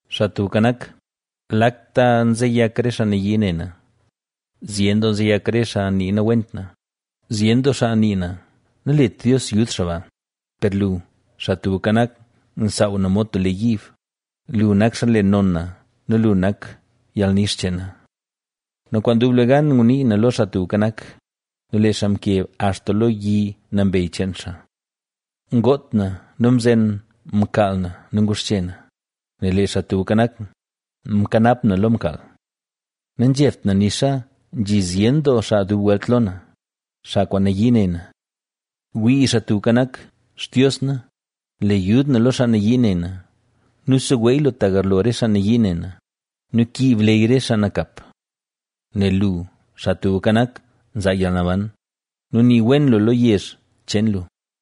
¡Xaa Tubka Nak, lakta nzeyak re xaa nayii ne na! Zyen doo nzeyak re xaa nii nawent na; zyen doo xaa nii na: “Nalet Dios yud xaa ba”. Per lu, Xaa Tubka Nak, nsaaw na mod tub lee yiib, lu nak xaa nle non na nu lu nak yalnix cheen na. Nu kwaan dublegan ngunii na lo Xaa Tubka Nak nu lee xaa mkeb axta lo yi nambey cheen xaa. Ngoot na nu mzen mkaal na nu nguxche na, nel lee Xaa Tubka Nak, mkanap na lo mkaal. Nazhebt na nixa nzhi zyen doo xaa dub welt lo na, xaa kwaan nayii ne na. ¡Wii, Xaa Tubka Nak! ¡Xtios na, le yud na lo xaa nayii ne na! Nu seweey lu ta garlo re xaa nayii ne na nu kiib leyy re xaa nakap. Nel lu, Xaa Tubka Nak, nzaa yalnaban ¡nu nii wen lu lo yezh cheen lu!